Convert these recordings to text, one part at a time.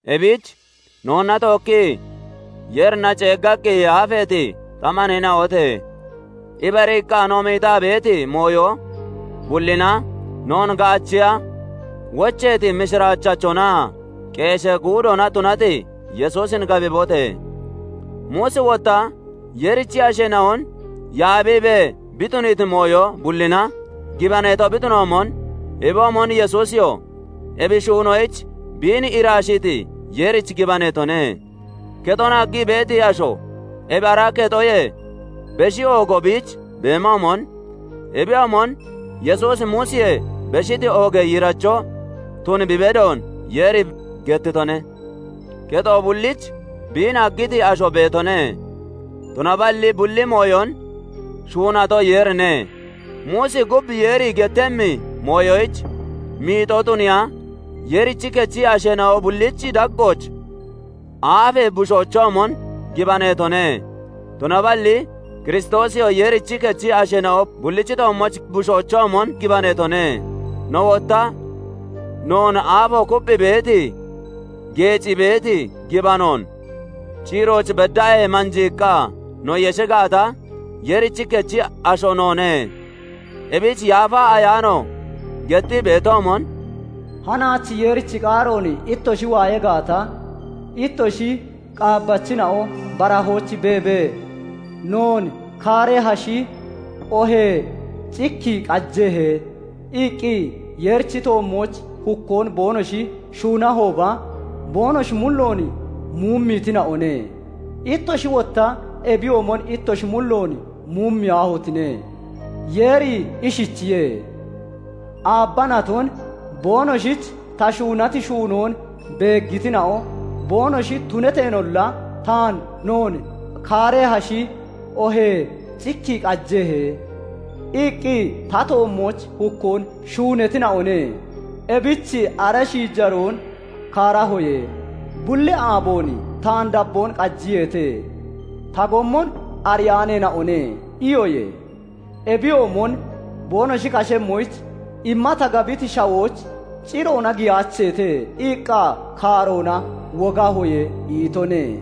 Ebich noonna tookkii Yeerina ceeggaqqi yaafeeti ta maneena'ote! Ibariiqqa no miixaa beeti mooyo bullina noon gaachiya wocheeti mishiraachachonaa qeeshee guudoona tunati Yesuusin gabibote! Muusi wotta Yeerichi asheena'on yaabiibee bi tuniiti mooyo bullina gibaneeto bi tunatoomon, ebiyoomon Yesuusiyoo ebi shuunoyich biin iraashiiti Yeerich gibaneetone. Kexon haggii beeti asho ebi ara kexoyee beshi oogo biich beemoomon, ebiyoomon Yesuusi Muusiyee beshiti oogee yiiracho tun bi bedon Yeeri gettitone. Kexo bullich biin haggiti asho beetone; tunaballi bulli mooyon shuunato Yeerine. Muusi gub Yeeri gettemmi mooyoyich miixoo tuniya Yeerichi kechi asheena'o bullichi daggooch aafee bushoochoomon gibaneetone. Tunaballi Kiristoosiyoo Yeerichi kechi asheena'o bullichi toommooch bushoochoomon gibaneetone. No wotta noon aafo kupphii beeti, geecii beeti gibanoon [ciirooch beddaahee manjiiqqaa] no yeshi gaata, Yeerichi kechi asho noone. Ebich Yaafa Ayaano gettii beetoomon, "Hanaach Yeerichi qaaroon ittoshi waaya gaata, ittoshi qaabbachina'o barahooch beebee, 'Noon kaarehashi oohee cikki qajehe?' iqqi, Yeerichi toommooch hukkoon boonoshi shuunahooba, boonoshi mulloon muumiitina'one. Ittoshi wotta ebiyoomon ittoshi mulloon muumiyaahotine! Yeeri ishichiye:- 'Aabba naton boonoshich ta shuunati shuunoon beeggitina'o boonoshi tunateenolla, taan "Noon kaarehashi oohee cikki qajehe?" iqqi, ta toommooch hukkoon shuunatina'one. Ebich ara shiijaroon kaarahoye; "Bulli aaboon taan dabboon qajiyeete; ta gommon ariyaaneena'one" iyoye; Ebiyoomon "Boonoshi kashemmoyich imma ta gabiti shawooch ciroona giyaacheete" iqqa kaaroona wogahoye' itone."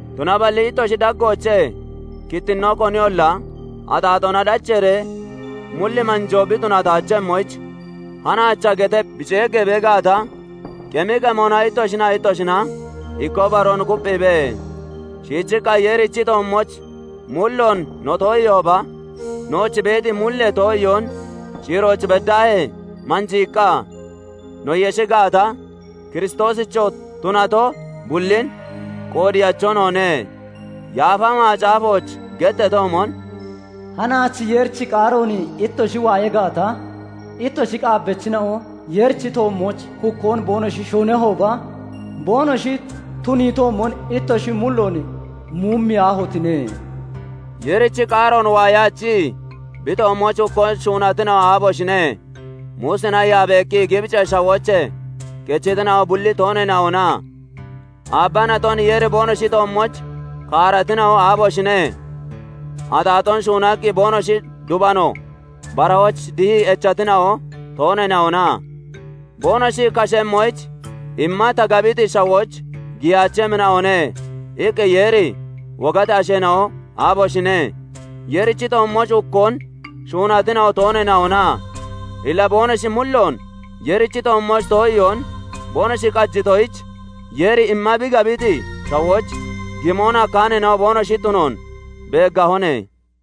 Tunaballi ittoshi daggoochee kittinnoo koniyolla axaaxoona dacheeree mulli manjoo bi tunataachemmoyich, "Hanaacha" getee bi ceeggee bee gaata, qemi qemona ittoshinaa ittoshina ikkoo baroon kupphiibe. Shiichiqqa Yeerichi toommooch mulloon no too'iihooba, nooch beeti mullee too'iyoon ciirooch beddaahee manjiiqqa no yeshi gaata, Kiristoosicho tunato bullin qoodeyacho noone. Yaafa Macaafooch getteetoomon, "Hanaach Yeerichi qaaroon ittoshi waaya gaata, Ittoshi qaabbachina'o Yeerichi toommooch hukkoon boonoshi shuunahooba, Boonoshi tuniitoomon, ittoshi mulloon muumiyaahotine!" Yeerichi qaaroon waayaachii, bi toommooch hukkoon shuunatina'o aaboshine? Muusina yaabeeqqi Gibicee Shawoochee kechitina'o bulli tooneena'ona? Aabba naton Yeeri boonoshi toommooch kaaratina'o, aaboshine? Axaaxoon shuunaqqi boonoshi dubano barahooch dihii echatina'o, tooneena'ona? "Boonoshi kashemmoyich imma ta gabiti shawooch giyaachemmina'one!" iqqi Yeeri wogati asheena'o, aaboshine? Yeerichi toommooch hukkoon shuunatina'o tooneena'ona? Illa boonoshi mulloon Yeerichi toommooch too'iyoon boonoshi qajitoyich, Yeeri imma bi gabiti shawooch gimon hakkaaneena'o boonoshi tunoon beeggahone.